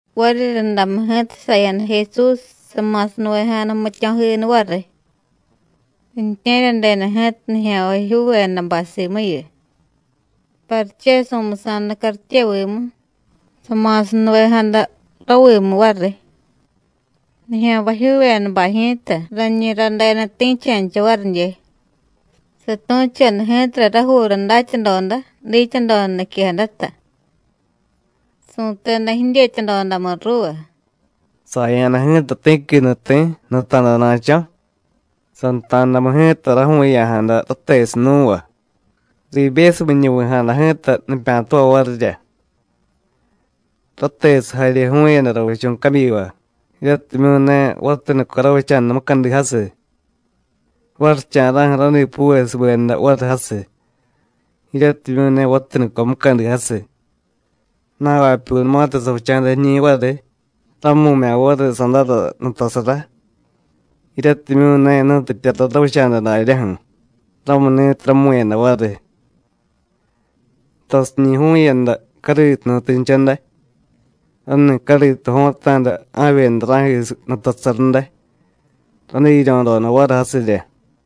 Variryundamu ji̱ta saya̱da Jesús, sama̱sanuvejada jmityo̱jiniy variy. Riintye̱ryadeda ji̱ta nijya̱nvajyuuvedabay simuyu. Pariche su̱musa̱da cartyevimu, sama̱sanuvejada ravimu variy. Nijya̱nvajyuuvedabay ji̱ta rañi radeda ti̱cha̱ncha varidye. Satu̱choda ji̱tara rajuura datyadoda, dityadoda niquejadata. Su̱teda jidyetyadodamu ruuva: “Saya̱da ji̱ta ti̱qui nuti̱ nuta̱dana̱cho̱. Santa̱damu ji̱ta raju̱u̱ya̱jada ratesiy nú̱va, riibyesumiñuvi̱jada ji̱ta nipya̱tavay varirya. Ratesiy jarye ju̱u̱yada ravichu̱ cabyiva, jiryatimyu̱ ne vatanuco ravicha̱da mucadi jasiy. Varicha̱ra̱ju̱ radipuvesubeda variy jasiy, jiryatimyu̱ ne vatanuco mucadi jasiy. Na̱vapyunumatiy savicha̱da jiñi̱ variy, ramu̱mya̱ variy sadára nutasara, jiryatimyu̱ ne jnutityara ravicha̱da daryaju̱, ramuni̱tiy ramu̱yada variy. Tasiñi̱ ju̱u̱yada cariitujnutincha day, rani̱ cariitu jo̱ta̱da ja̱vyeda ra̱jisiy nutasara day, radiryo̱doda variy jasirya.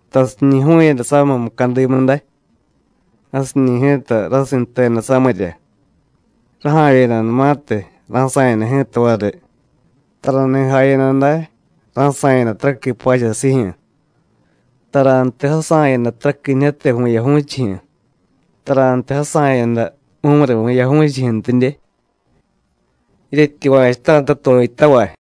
Tasiñi̱ ju̱u̱yada samiy mucadimu day, jasiñi̱ ji̱ta rasinteda samirya. Raja̱vyedanumatiy, ra̱sa̱yada ji̱ta variy, tarani̱ jayada day ra̱sa̱yada taraqui pachasijyu̱, tarantiy jasa̱yada taraquinijyate vu̱yaju̱chijyu̱, tarantiy jasa̱yada mumuri̱ vu̱yaju̱chijyu̱ntidye. Jiryetyuva̱chuta̱ta tu̱yutavay.”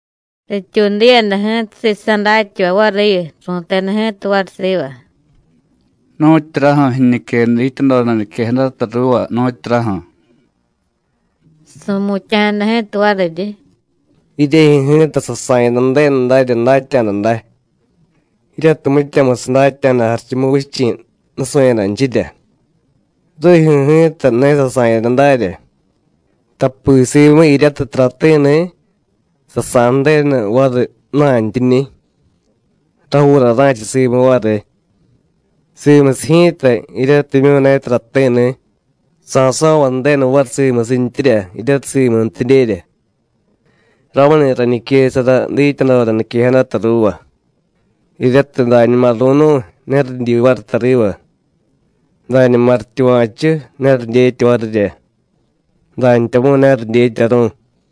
Rityuudiyada ji̱ta sisa̱ datyavay variyu, ru̱teda ji̱ta variy siva: “¿Nu̱tyuraju̱ jiñique dityadoda niquejadata ruuva, nu̱tyuraju̱?” Su̱mutya̱jada ji̱ta variryi: “Jiryejyu̱ ji̱ta sasa̱yada Ju̱denu darya datya̱da day, jiryatiy mityamusiy datya̱da Jarichumuvichi̱ nusu̱yadanchirya, rijyu̱ ji̱ta ne sasa̱yada darya. Tapi simu jiryatiy tarati̱ni̱, sa̱sa̱y Ju̱denu variy ju̱na̱ntyiñi̱, rajuura ra̱cha simu variy. Simusiy ji̱ta jiryatimyu̱ ne tarati̱ni̱, sa̱so̱vay Ju̱denu variy simusintyirya jiryatiy simuntidyerya. Ramuni̱ rañiquesara dityadoda niquejadata ruuva, jiryatiy dañuma ru̱nu̱y, ne ridyi variy tariva; dañuma rityuva̱chu, ne ridyetya varirya, dantyamu̱y ne ridyetyaru̱y.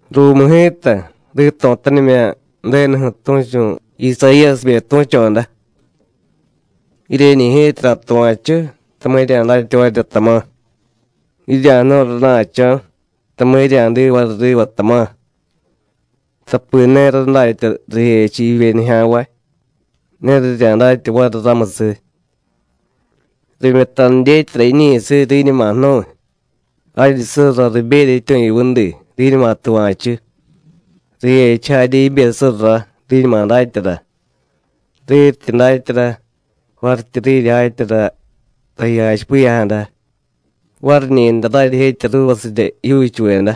Ruumu ji̱ta, rito̱tanimya̱ Ju̱denuju̱ tu̱chu̱ Isayíyasibe tu̱choda: Jiryeñi̱ ji̱ta ra̱tuva̱chu, tama̱ jirya̱datya varirya, tama̱, jirya̱jnu̱y rana̱cho̱, tama̱ jirya̱diy variy riva, tama̱. Tapi ne radatya rijechiy jivye nijya̱nvay, ne rirya̱datya variy ramusiy. Rimyutanu dyetyara jiñi̱siy, riñuma jnu̱y, jaryi surra riberya jityu̱yuvudi, riñuma tuva̱chu, rijechiy jarye jibe surra, riñuma datyara. Riryityi datyara, varityi riryijetyara taji jachipiya̱jada, variñi̱day raryijetya ruuvasirya jijyuuchuveda.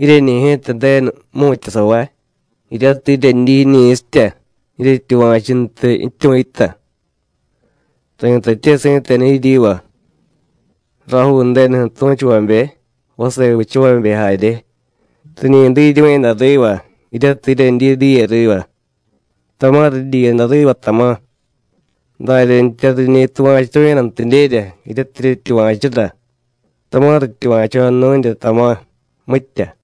Jiryeñi̱ ji̱ta Ju̱denu jmu̱tyasavay, jiryatiy jiryedyi jiñi̱sitya, jiryetyuva̱chuntiy jityu̱yuta. Ri̱tatye si̱tenu jiryiva: Rajuu Ju̱denuju̱ tu̱chuvabe, vase vichavabe jarye, riñi diryu̱yada riva jiryatiy jiryedyi diye riva, tama̱ ridyiyada riva, tama̱; daryantya, riñi tuva̱churu̱yadantidyerya jiryatiy jiryetyuva̱chura, tama̱ rityuva̱choda nu̱nrya, tama̱, mitya.”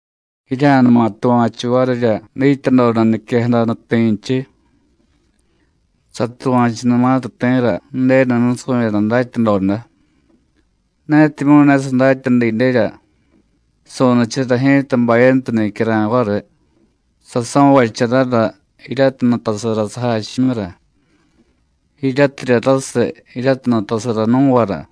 “Jirya̱numa tuva̱chu varirya dityadoda niquejada nuti̱nchiy. Satuva̱chunumatiy ti̱ra Ju̱denu nusu̱yada datyadoda, netimyu̱ ne sadatya didyerya, su̱nichara ji̱ta bayantu nicyara̱y variy, saso̱vacharara jiryatiy nutasara sajachimyura. Jiryatirya rasiy jiryatiy nutasara nú̱vara.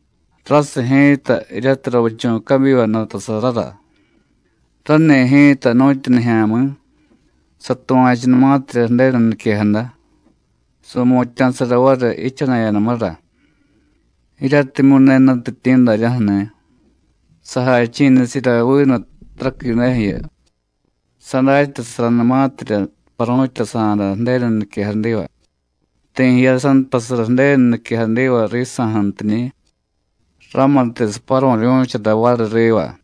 Rasiy ji̱ta jiryatiy ravichu̱ cabyiva nutasarara, rani̱ ji̱ta nu̱tyu nijya̱mi̱, satuva̱chunumatirya Ju̱denu niquejada, su̱mutya̱sara variy jichana̱yadamura. Jiryatimyu̱ ne jnutityi̱ daryaju̱ni̱, sajachi̱nichara vinu taraquideju̱yu. Sadatyasaranumatirya paru̱tyasa̱da Ju̱denu niquejadiva, ti̱ jiyasantasara Ju̱denu niquejadiva risa̱ju̱ntiñi̱, ramutiy saparu̱ryu̱chara variy riva.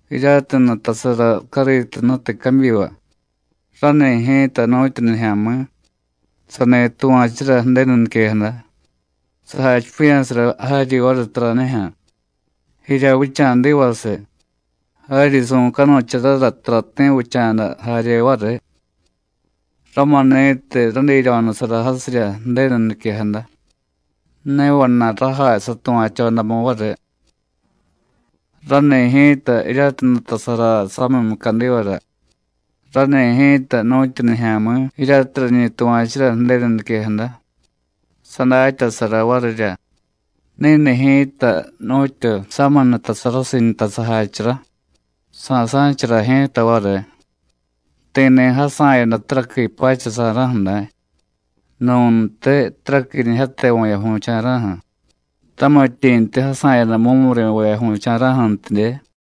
Jiryatiy nutasara cariitujnutiy cabyiva, rani̱ ji̱ta nu̱tyu nijya̱mi̱, sani tuva̱chura Ju̱denu niquejada, sajachipiya̱sara jaryi variy taranijyu̱, jirya vicha̱divasiy, jaryi su̱canucharara tarati̱ vicha̱da jarye variy. Ramuni̱tiy radiryo̱nusara jasirya Ju̱denu niquejada, ne vana̱y rajay satuva̱chodamu variy. Rani̱ ji̱ta jiryatiy nutasara samiy mucadivara, rani̱ ji̱ta nu̱tyu nijya̱mi̱ jiryatiy rañi tuva̱chura Ju̱denu niquejada, sadatyasara varirya. Ni̱ni̱ ji̱ta nu̱tyu samiy nutasarasiy nta sajachara, sa̱sa̱chara ji̱ta variy. Ti̱ni̱ jasa̱yada taraqui pacha sa̱ra̱ju̱ day, nu̱ntiy taraquinijyate vu̱yaju̱cha̱ra̱ju̱, tamityi̱ntiy jasa̱yada mumuri̱ vu̱yaju̱cha̱ra̱ju̱ntidye.”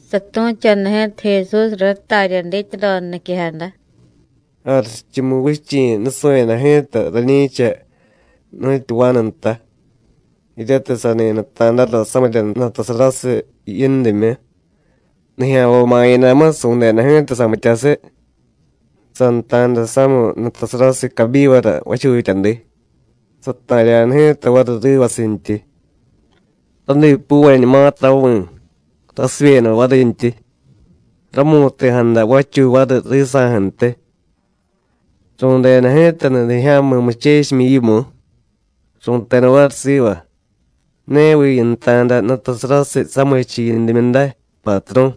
Satu̱choda ji̱ta Jesúsra ratarya dityadoda niquejada: “Jarichumuvichi̱ nusu̱yada ji̱ta rani̱cha nu̱tyu vanu nta jiryatiy sani nuta̱dara samirya nutasarasiy yindimyu. Nijya̱nvay ma̱yadamu, su̱deda ji̱ta samityasiy, santa̱da samiy nutasarasiy cabyivara vachutyadi, sata̱rya̱da ji̱ta variy rivasintyi. Radipuvañumatiy ravi̱, rasivyeda varintyi, ramu̱ti̱jada vachuy variy risa̱ju̱ntiy. Ru̱deda ji̱ta nudijya̱mi̱ muchechimyi yimu, ru̱teda variy siva: ¿Neviy yinta̱da nutasarasiy samichiy yindimyu day, Patru̱?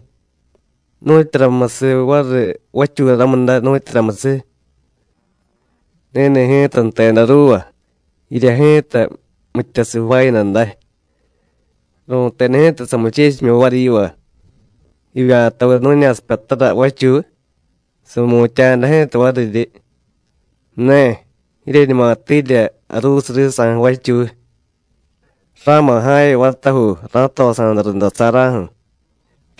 ¿Nu̱tyuramusiy variy vachuy ramu day, nu̱tyuramusiy? Ni̱ni̱ ji̱ta jteda ruuva: Jirya ji̱ta mityasiy jvaayada day. Ru̱teda ji̱ta samuchechimyi variy yiva: ¿Jivya̱taviy nu̱ña̱sipyatara vachuy? Su̱mutya̱jada ji̱ta variryi: Ne, jiryeñuma tiirya jaruusiy risa̱ju̱ vachuy. Ra̱ma̱ ja̱vye vatajuu, ra̱tosa̱da rundasa̱ra̱ju̱.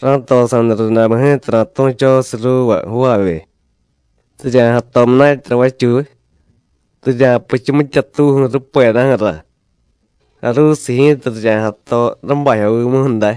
Ra̱tosa̱da rundamu ji̱ta ra̱tu̱chosiy ruuva jvaavye, rirya̱jato munatyara vachuy, rirya̱puchu mityatuuju̱ rupedaju̱ra. Jaruusiy ji̱ta rirya̱jato rábajyovimuju̱ day.”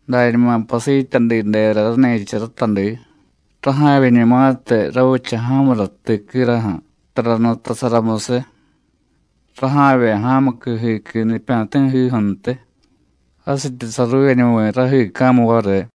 Dañuma pasityadidera rani̱cha ratadi, raja̱vyeñumatiy ravicha ja̱mura tiquiraju̱ tara nutasaramusiy. Raja̱vye ja̱muqui jiiqui nipya̱ti̱jiju̱ntiy, jasityi saruuvyeñuvi̱ rajiica̱mu variy.”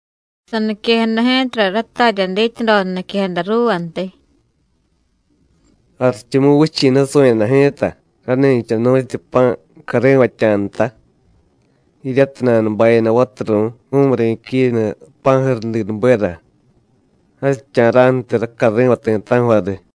Saniquejada ji̱tara ratarya dityadoda niquejada ruuvantiy: “Jarichumuvichi̱ nusu̱yada ji̱ta rani̱cha nu̱tyu pa̱ cari̱vatya̱ nta, jiryatiy nanubayada vaturu̱y mumuri̱ quinu pa̱jurudinubera, jasicha̱ra̱ju̱tiy racari̱vay ti̱ta̱ju̱ variy.”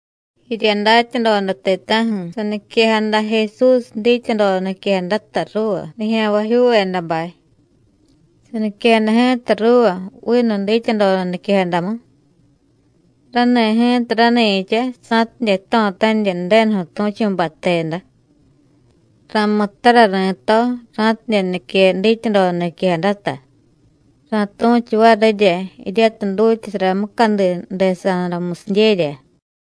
Jirya datyadoda ti̱ta̱ju̱ saniquejada Jesús dityadoda niquejadata ruuva nijya̱nvajyuuvedabay. Saniquejada ji̱ta ruuva vinu dityadoda niquejadamu. Rani̱ ji̱ta rani̱cha sa̱tidye jto̱tanirya Ju̱denuju̱ tu̱chu̱bay jteda: “Ra̱muttara ri̱to ra̱tidye nique dityadoda niquejadata; ra̱tu̱chu varirya jiryatiy dutyasara mucadi ju̱desa̱damusidyerya.”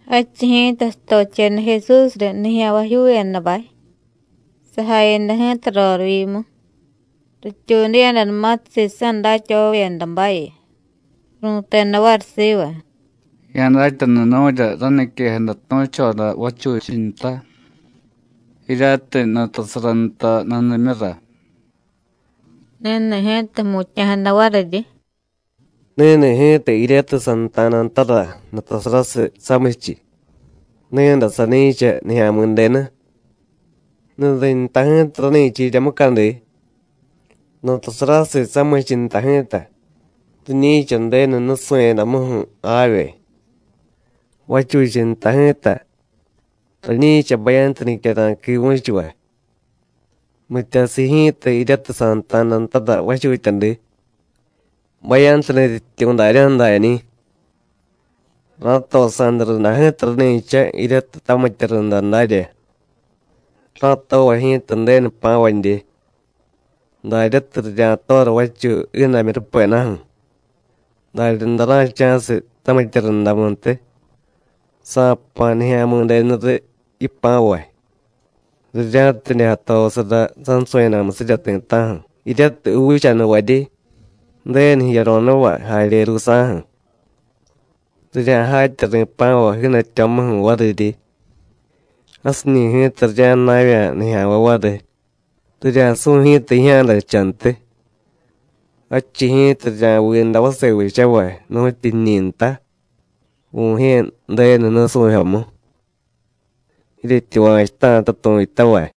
Jadchiy ji̱ta satocheda Jesús riy nijya̱nvajyuuvedabay, sajayada ji̱ta rorivyimu. Rityuudiyadanumatiy sisa̱ datyavavyedabayu, ru̱teda variy siva: “Ya̱datyanu nu̱rya raniquejada tu̱choda vachunchiy nta, jiryatiy nutasara nta nudimyura.” Ni̱ni̱ ji̱ta jmutya̱jada variryi: “Ni̱ni̱ ji̱ta jiryatiy santa̱da ntara nutasarasiy samichiy, ni̱day sani̱cha Nijya̱mi̱denu. Nudiy nta ji̱ta rani̱cha jirya mucadi. Nutasarasiy samichiy nta ji̱ta riñi̱cha Ju̱denu nusu̱yadamuju̱ javye. Vachuchiy nta ji̱ta rani̱cha bayantu nicyara̱y quivu̱chuvay. Mityasiy ji̱ta jiryatiy santa̱da ntara vachutyadi, bayantu nutyityu̱ daryaju̱ dañi̱. Ra̱tosa̱da runda ji̱ta rani̱cha jiryatiy tamitya runda darya. Ra̱tovay ji̱ta Ju̱denu jpa̱vadye. Daryatiy rirya̱tora vachuy jiidamyu rupedaju̱, daryaday ra̱cha̱siy tamitya rundamuntiy. Sa̱jpa̱ Nijya̱mi̱denu riy yipa̱vay, rirya̱tidye jatosara sansu̱yadamusirya ti̱ta̱ju̱ jiryatiy juuchanuvaryi, Ju̱denu jiyaro̱nuvay jarye ruusa̱ju̱. Rirya̱jatya ri̱pa̱vay jiidatyo̱muju̱ variryi. Jasiñi̱ ji̱ta rirya̱jna̱vya̱ nijya̱nvay variy, rirya̱su̱y ji̱ta jijya̱dajchantiy. Jadchiy ji̱ta rirya̱viiday vase vichavay, nu̱tyu jiñi̱ nta, Vu̱jye̱ Ju̱denu nusu̱jyomu. Jiryetyuva̱chuta̱ta tu̱yutavay.”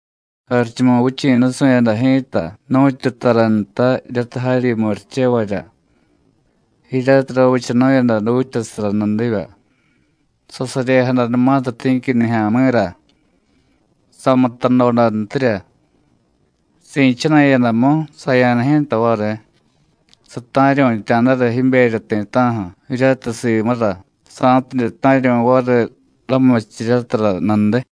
“Jarichumuvichi̱ nusu̱yada ji̱ta nu̱tyu tara nta jiryatiy jaryi murichevarya, jiryatiy ravichanu̱yada dutyasara nudivya. Sasaryejadanumatiy ti̱qui nijya̱mi̱ra, samutadodantirya. Si̱chana̱yadamu, saya̱da ji̱ta variy, sata̱ryu̱tya̱dara jiberya ti̱ta̱ju̱ jiryatiy simura, sa̱tidye ta̱ryu̱y variy ramurichiryatara nudiy.”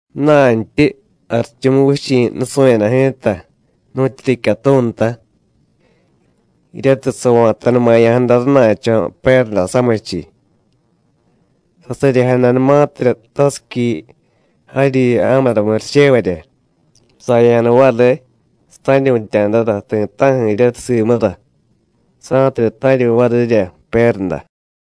“Ju̱na̱ntyi, Jarichumuvichi̱ nusu̱yada ji̱ta nu̱tyu ricyatu̱ nta jiryatiy sava̱tanumaya̱jada rana̱cho̱ pérda samichiy. Sasaryejadanumatirya tasiqui jaryi ja̱mura murichevarya, saya̱da variy, sata̱ryu̱tya̱dara ti̱ta̱ju̱ jiryatiy simura, sa̱tidye ta̱ryu̱y varirya pérda.”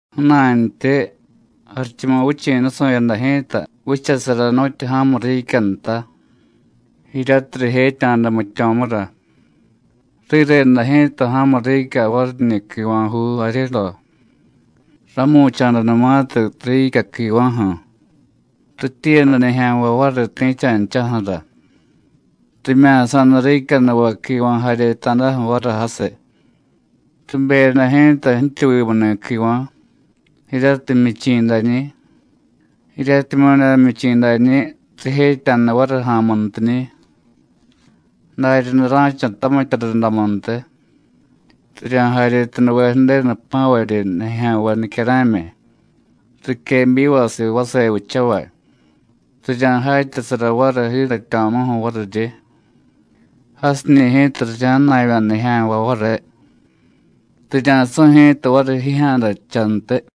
“Ju̱na̱ntyi, Jarichumuvichi̱ nusu̱yada ji̱ta vichasara nu̱tyu ja̱mu riicya nta, jiryatiy rijetya̱da jmityo̱mura. Rireda ji̱ta ja̱mu riicya variñi̱ quiva̱juu jaryedo. Rámu̱cha̱danumatiy riicya quiva̱ju̱, rityiiyada nijya̱nvay variy ti̱cha̱nchaju̱ra. Rimya̱sa̱da riicyanuvay quiva̱ jaryeta̱daju̱ variy jasiy. Ribeyada ji̱ta jtyuvimuni̱ quiva̱ jiryatiy jmyichi̱ dañi̱; jiryatimyu̱ ne jmyichi̱ dañi̱, rijetya̱da variy ja̱a̱muntiñi̱. Daryaday ra̱cha tamitya rundamuntiy. Rirya̱jaryetanuve Ju̱denu jpa̱varyi nijya̱nvay nicyara̱myi riquebyivasiy vase vichavay, rirya̱jatyasara variy jiidatyo̱muju̱ variryi. Jasiñi̱ ji̱ta rirya̱jna̱vya̱ nijya̱nvay variy, rirya̱su̱y ji̱ta variy jijya̱dajchantiy.”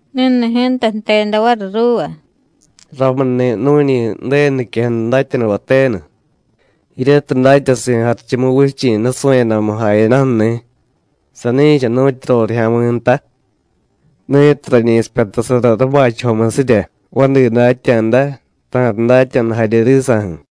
Ni̱ni̱ ji̱ta jteda variy ruuva: “Ramuni̱ nu̱ñi Ju̱denu niquejada datyanuvay tenu jiryatiy datyasi̱ Jarichumuvichi̱ nusu̱yadamu jayadaju̱ni̱, sani̱cha nu̱tyu rorijya̱mi̱ nta ni̱tiy rañi sipyatasara rabachajomusirya vadi datya̱da, ta̱riy datya̱da jarye risa̱ju̱.”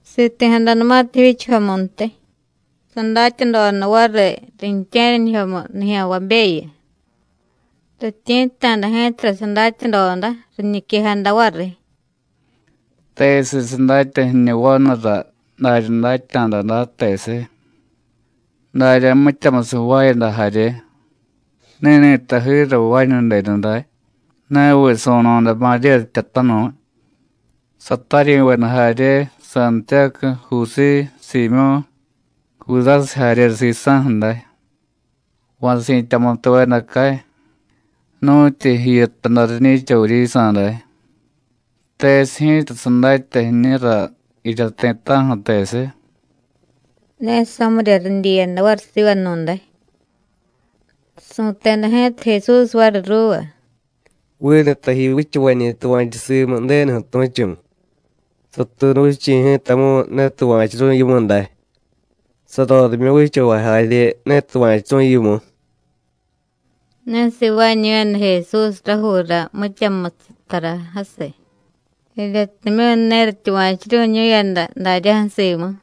Siti̱jadanumatiy jivyichajomuntiy, sadatyadoda variy riintye̱ryanijyomu nijya̱nvabeyu. Rityi̱tta̱da ji̱tara sadatyadoda, riñiquejada variy: “¿Tesiy sadatya jiñu vanura darya datya̱da day, tesiy? darya mityamusiy jvaayada jarye. ¿Ni̱ni̱ta jiiray jvaañu denuday? ¿Neviy su̱no̱da Maríya jtyatanu̱y, sataryi̱veda jarye Santiyácu, Jusíy, Siimyó̱, Judásiy jarye sisa̱ju̱ day? ¿Va̱ si̱tyamutuveda cay, nu̱tyi jiyu jtaday riñi̱cha vuryisa̱ day? ¿Tesiy ji̱ta sadatya jiñura jirya ti̱ta̱ju̱, tesiy?” Ne samirya ridyiyada variy sivanu̱day. Su̱teda ji̱ta Jesús variy ruuva: “Vinu taji vichavañi̱ tuva̱chu simu Ju̱denuju̱ tu̱chu̱, satuunuvichi̱ ji̱tamu̱y ne tuva̱churu̱y yimu day, sarorimyu vichavay jarye ne tuva̱churu̱y yimu.” Ne sivaañu̱yada Jesús rajuura mityamusiy tara jasiy, jiryatimyu̱ ne rityuva̱churu̱ñu̱yada daryaju̱ simu.